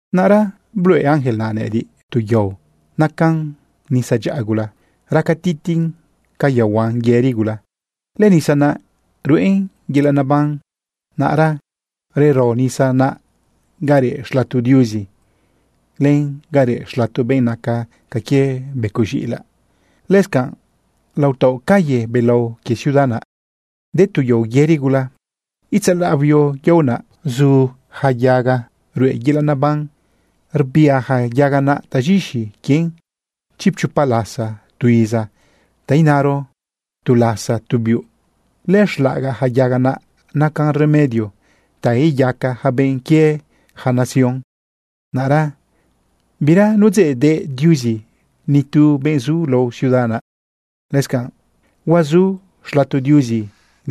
Naꞌra bluꞌe ángel naꞌ nëꞌëdiꞌ tu yao nacan nisa dyaꞌa gula raca titiꞌn ca yaohuan yëri gula. Lënisa naꞌ ruꞌen yelaꞌ neban. Naꞌra rero nisa naꞌ ga reꞌ xlato Diuzi len ga reꞌ xlato benꞌ naca ca quie becoꞌ z̃iꞌilaꞌ. Lëscanꞌ lao taoꞌ calle belao quie ciudad naꞌ, de tu yao yëri gula. Itzalaꞌ huio yao naꞌ, zu ja yaga ruꞌe yelaꞌ neban. Rbia ja yaga naꞌ taz̃ixi quien chipchopa lasa tu iza, ta inaro, tu lasa tu biuꞌ. Lëxlaꞌagaꞌ ja yaga naꞌ nacan remedio ta iyaca ja benꞌ quie ja nación. Naꞌra bira nudzeꞌdeꞌ Diuzi nitu benꞌ zu lao ciudad naꞌ. Lëscanꞌ huazu xlato Diuzi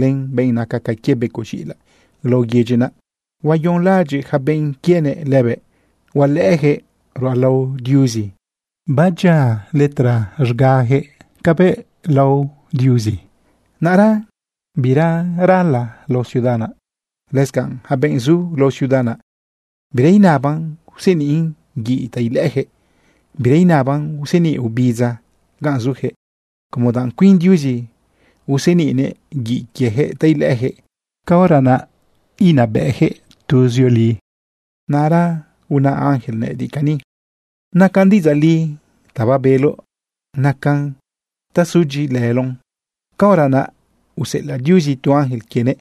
len benꞌ naca ca quie becoꞌ z̃iꞌilaꞌ lao yedyi naꞌ. Huayonlaꞌadyiꞌ yaca benꞌ quienëꞌ lëbëꞌ. Hualëꞌëjëꞌ ruꞌalao Diuzi. Badyia letra z̃gajëꞌ cabëꞌ lao Diuzi. Naꞌra bira rala lao ciudad naꞌ. Lëscanꞌ yaca benꞌ zu lao ciudad naꞌ, bira inaban useniꞌn guiꞌ ta ilëꞌëjëꞌ, bira inaban useniꞌ ubidza ganꞌ zujëꞌ, como danꞌ cuin Diuzi useniꞌnëꞌ guiꞌ quiejëꞌ ta ilëꞌëjëꞌ. Caora naꞌ inabëꞌjëꞌ tuzioli. Naꞌra una ángel nëꞌëdiꞌ cani: ―Nacan diꞌidzaꞌ li ta babeloꞌ. Nacan ta sudyiꞌilëloꞌn. Caora naꞌ useꞌelaꞌ Diuzi tu ángel quienëꞌ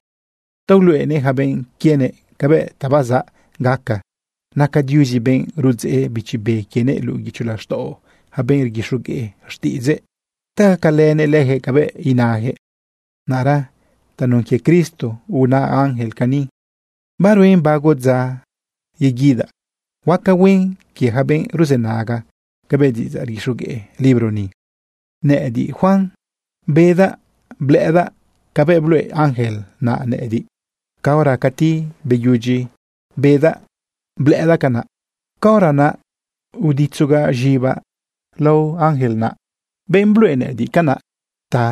ta uluꞌenëꞌ ja benꞌ quienëꞌ cabëꞌ ta bazaꞌ gaca. Naca Diuzi benꞌ rudzeꞌ Bichi Be quienëꞌ luꞌu guicho laxtaꞌo ja benꞌ rguixogueꞌ xtiꞌidzëꞌ ta gacalënëꞌ lëjëꞌ cabëꞌ inajëꞌ. Naꞌra tanun quie Cristo una ángel cani: ―Baruen bago dza yeguidaꞌ. ¡Huaca huen quie ja benꞌ ruzënaga cabëꞌ diꞌidzaꞌ rguixogueꞌ libro ni! Nëꞌëdiꞌ, Juan, bedaꞌ blëꞌëdaꞌ cabëꞌ bluꞌe ángel naꞌ nëꞌëdiꞌ. Caora cati beyudyi bedaꞌ blëꞌëdaꞌ canaꞌ, caora naꞌ uditzogaꞌ z̃ibaꞌ lao ángel naꞌ, benꞌ bluꞌe nëꞌëdiꞌ canaꞌ, ta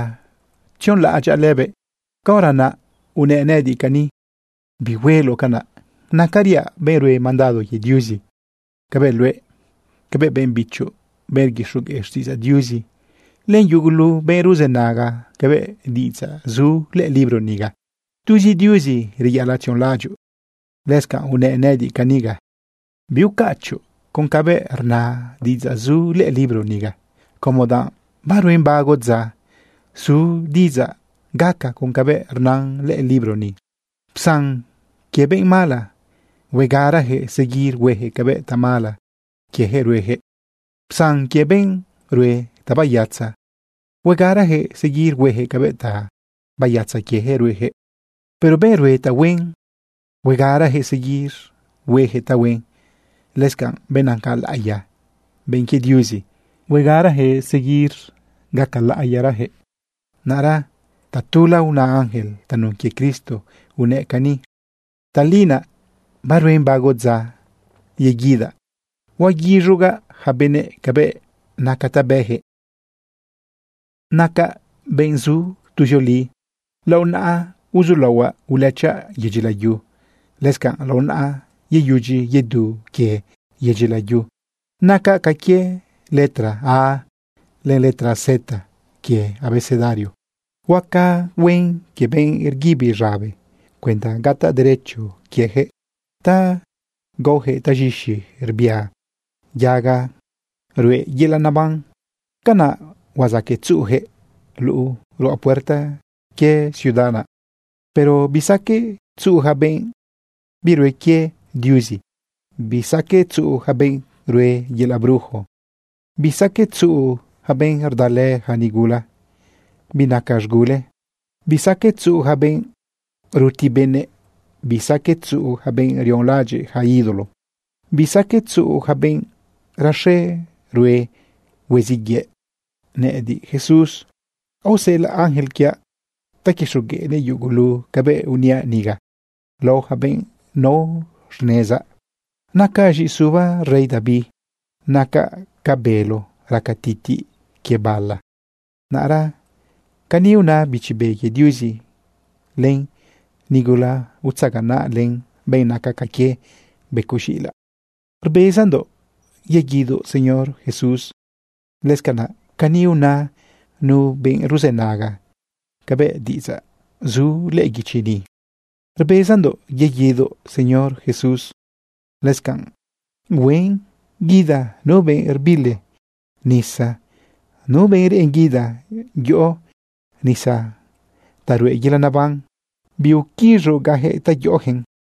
tzionlaꞌadyaꞌ lëbëꞌ. Caora naꞌ unëꞌ nëꞌëdiꞌ cani: ―Bihueloꞌ canaꞌ. Nacariaꞌ benꞌ rue mandado quie Diuzi cabëꞌ luëꞌ, cabëꞌ benꞌ bichoꞌ, benꞌ rguixogueꞌ xtiꞌidzaꞌ Diuzi, len yugulu benꞌ ruzënaga cabëꞌ diꞌidzaꞌ zu lëꞌë libro niga. Tuzi Diuzi reyaꞌalaꞌ tzionlaꞌadyoꞌ. Lëscanꞌ unëꞌ nëꞌëdiꞌ caniga: ―Biucachoꞌ con cabëꞌ rna diꞌidzaꞌ zu lëꞌë libro niga, como danꞌ baruen bago dza su diꞌidzaꞌ gaca con cabëꞌ rnan lëꞌë libro ni. Psan quie benꞌ mala. Huegarajëꞌ seguir huejëꞌ cabëꞌ tamala quiejëꞌ ruejëꞌ. Psan quie benꞌ rue tabayatza. Huegarajëꞌ seguir huejëꞌ cabëꞌ tabayatza quiejëꞌ ruejëꞌ. Pero benꞌ rue tahuen, huegarajëꞌ seguir huejëꞌ tahuen. Lëscanꞌ benꞌ naca laꞌiya, benꞌ quie Diuzi, huegarajëꞌ seguir gaca laꞌiyarajëꞌ. Naꞌra tatula una ángel tanun quie Cristo, unëꞌ cani: ―Tali naꞌ baruen bago dza yeguidaꞌ. Huaguiz̃ugaꞌ ja benëꞌ cabëꞌ naca ta bëjëꞌ. Nacaꞌ benꞌ zu tuzioli. Lao naꞌa uzulaohuaꞌ ulëchaꞌ yedyi layu. Lëscanꞌ lao naꞌa yeyudyi yedu quie yedyi layu. Nacaꞌ ca quie letra A len letra Z quie abecedario. Huaca huen quie benꞌ rguibi z̃abe cuenda gataꞌ derecho quiejëꞌ ta gaojëꞌ taz̃ixi rbia yaga ruꞌe yelaꞌ neban. Canaꞌ huazaqueꞌ tzuꞌujëꞌ luꞌu ruꞌa puerta quie ciudad naꞌ. Pero bisaqueꞌ tzuꞌu ja benꞌ birue quie Diuzi, bisaqueꞌ tzuꞌu ja benꞌ rue yelaꞌ brujo, bisaqueꞌ tzuꞌu ja benꞌ rdalë ja nigula binaca z̃gule, bisaqueꞌ tzuꞌu ja benꞌ ruti benëꞌ, bisaqueꞌ tzuꞌu ja benꞌ rionlaꞌadyiꞌ ja ídolo, bisaqueꞌ tzuꞌu ja benꞌ raxe rue hueziꞌ yëꞌ. ―Nëꞌëdiꞌ, Jesús, aoseꞌelaꞌ ángel quiaꞌ ta quixogueꞌnëꞌ yugulu cabëꞌ uniaꞌ niga lao ja benꞌ nao xnezaꞌ. Nacaꞌ z̃iꞌisuba rey David. Nacaꞌ ca bélo raca titiꞌ quie bala. Naꞌra cani una Bichi Be quie Diuzi len nigula utzaganaꞌlë benꞌ naca ca quie becoꞌ z̃iꞌilaꞌ: ―Rbezandoꞌ yeguidoꞌ, Señor Jesús. Lëscanaꞌ cani una nu benꞌ ruzënaga cabëꞌ diꞌidzaꞌ zu lëꞌë guichi ni: ―Rbezandoꞌ yeguidoꞌ, Señor Jesús. Lëscanꞌ huen guida nu benꞌ rbili nisa, nu benꞌ reꞌen guida yoꞌo nisa ta ruꞌe yelaꞌ neban. Biquiz̃ugaꞌjëꞌ ta yoꞌojëꞌn.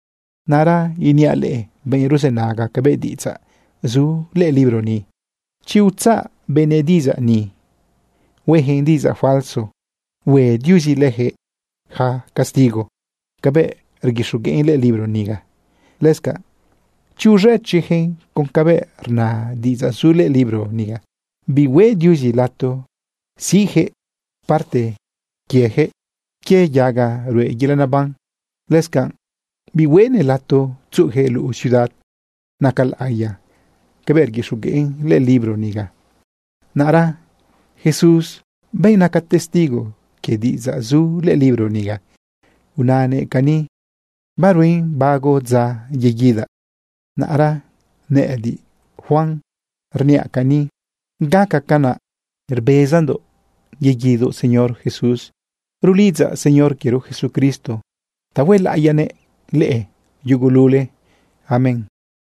Naꞌra iniaꞌ leꞌe, benꞌ ruzënaga cabëꞌ diꞌidzaꞌ zu lëꞌë libro ni: Chi utzaꞌ benëꞌ diꞌidzaꞌ ni, huejëꞌn diꞌidzaꞌ falso, hue Diuzi lëjëꞌ ja castigo cabëꞌ rguixogueꞌn lëꞌë libro niga. Lëscanꞌ chi uz̃ëchiꞌjëꞌ con cabëꞌ rna diꞌidzaꞌ zu lëꞌë libro niga, bihueꞌ Diuzi lato siꞌjëꞌ parte quiejëꞌ quie yaga ruꞌe yelaꞌ neban. Lëscanꞌ bihueꞌnëꞌ lato tzuꞌujëꞌ luꞌu ciudad naca laꞌiya cabëꞌ rguixogueꞌn lëꞌë libro niga. Naꞌra Jesús, benꞌ naca testigo quie diꞌidzaꞌ zu lëꞌë libro niga, unanëꞌ cani: ―Baruen bago dza yeguidaꞌ. Naꞌra nëꞌëdiꞌ, Juan, rniaꞌ cani: ―Gaca canaꞌ. ¡Rbezandoꞌ yeguidoꞌ, Señor Jesús! Rulidzaꞌ Señor quiero Jesucristo ta huelaꞌiyanëꞌ leꞌe yugulule. Amén.